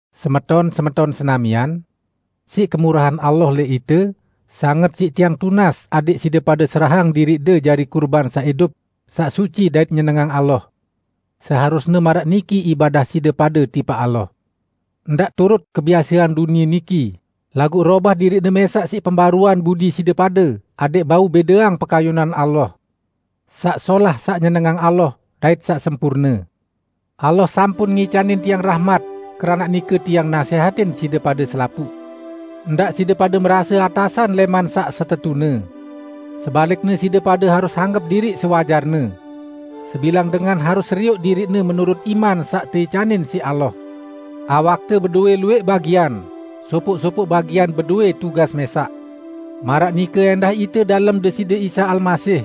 Semeton-semeton senamian! Siq kemurahan Allah lẽq ite, sanget siq tiang tunas adẽq side pade serahang diriqde jari kurban saq idup, saq suci dait nyenengang Allah. Seharusne maraq niki ibadah side pade tipaq Allah. Ndaq turut kebiasean dunie niki, laguq robah diriqde mẽsaq siq pembaruan budi side pade, adẽq bau bẽdeang pekayunan Allah: Saq solah, saq nyenengang Allah, dait saq sempurne. Allah sampun ngicanin tiang rahmat, keranaq nike tiang nasẽhatin side pade selapuq: Ndaq side pade merase atasan lẽman saq setetune. Sebalikne side pade harus anggep diriq sewajarne. Sebilang dengan harus serioq diriqne menurut iman saq teicanin siq Allah. Awakte bedowẽ luwẽq bagian, sopoq-sopoq bagian bedowẽ tugas mẽsaq. Maraq nike ẽndah ite dalem Deside Isa Almasih.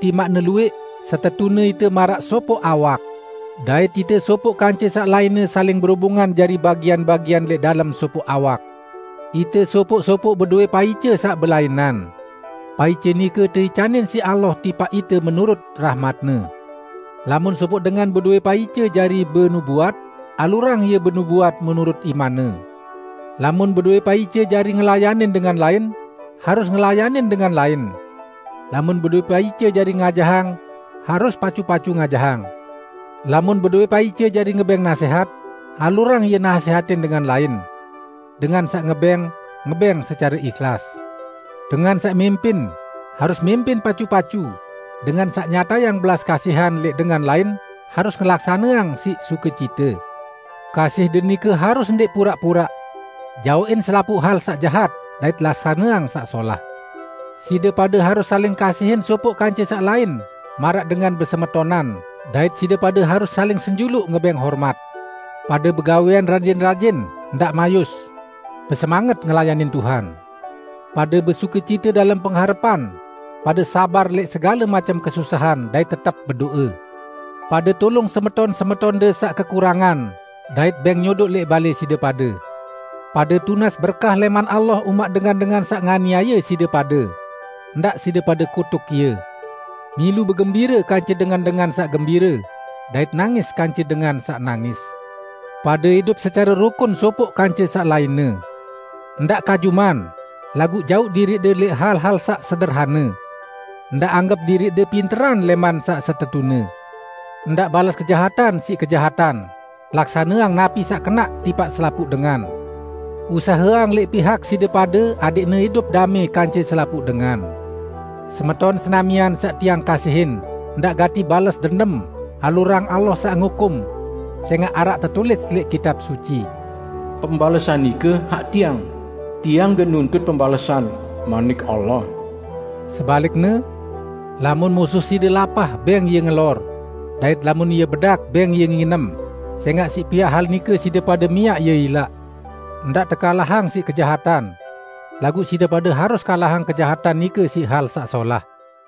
Timaqne luwẽq, setetune ite maraq sopoq awak. Dait ite sopoq kance saq lainne saling berubungan jari bagian-bagian lẽq dalem sopoq awak. Ite sopoq-sopoq bedowẽ paice saq belainan. Paice nike teicanin siq Allah tipaq ite menurut rahmat-Ne. Lamun sopoq dengan bedowẽ paice jari benubuat, alurang ie benubuat menurut imanne. Lamun bedowẽ paice jari ngelayanin dengan lain, harus ngelayanin dengan lain. Lamun bedowẽ paice jari ngajahang, harus pacu-pacu ngajahang. Lamun bedowẽ paice jari ngebẽng nasẽhat, alurang ie nasẽhatin dengan lain. Dengan saq ngebẽng, ngebẽng secare ihlas. Dengan saq mimpin, harus mimpin pacu-pacu, dengan saq nyatayang belas kasihan lẽq dengan lain harus ngelaksaneang siq sukecite. Kasihde nike harus ndẽq puraq-puraq. Jaoqin selapuq hal saq jahat, dait laksaneang saq solah. Side pade harus saling kasihin sopoq kance saq lain maraq dengan besemetonan dait side pade harus saling senjuluq ngebẽng hormat. Pade begawẽan rajin-rajin, ndaq mayus. Besemanget ngelayanin Tuhan. Pade besukecite dalem pengharepan, pade sabar lẽq segale macem kesusahan dait tetep bedo'e. Pade tulung semeton-semetonde saq kekurangan dait bẽng nyodoq lẽq balẽ side pade! Pade tunas berkah lẽman Allah umaq dengan-dengan saq nganiaye side pade. Ndaq side pade kutuk ie. Milu begembire kance dengan-dengan saq gembire, dait nangis kance dengan saq nangis. Pade idup secare rukun sopoq kance saq lainne. Ndaq kajuman, laguq jauq diriqde lẽq hal-hal saq sederhane. Ndaq anggep diriqde pinteran lẽman saq setetune. Ndaq bales kejahatan siq kejahatan, laksaneang napi saq kenaq tipaq selapuq dengan. Usaheang lẽq pihak side pade adẽqne idup damẽ kance selapuq dengan. Semeton senamian saq tiang kasihin, ndaq gati bales dendem, alurang Allah saq ngukum. Sẽngaq araq tetulis lẽq Kitab Suci: "Pembalesan nike hak Tiang. Tiang gen nuntut pembalesan, manik Allah." Sebalikne lamun musuh side pade lapah, bẽng ie ngelor; dait lamun ie bedak bẽng ie nginem, sẽngaq siq piaq hal nike side pade miaq ie ilaq. Ndaq tekalahang siq kejahatan. Laguq side pade harus kalahang kejahatan nike siq hal saq solah.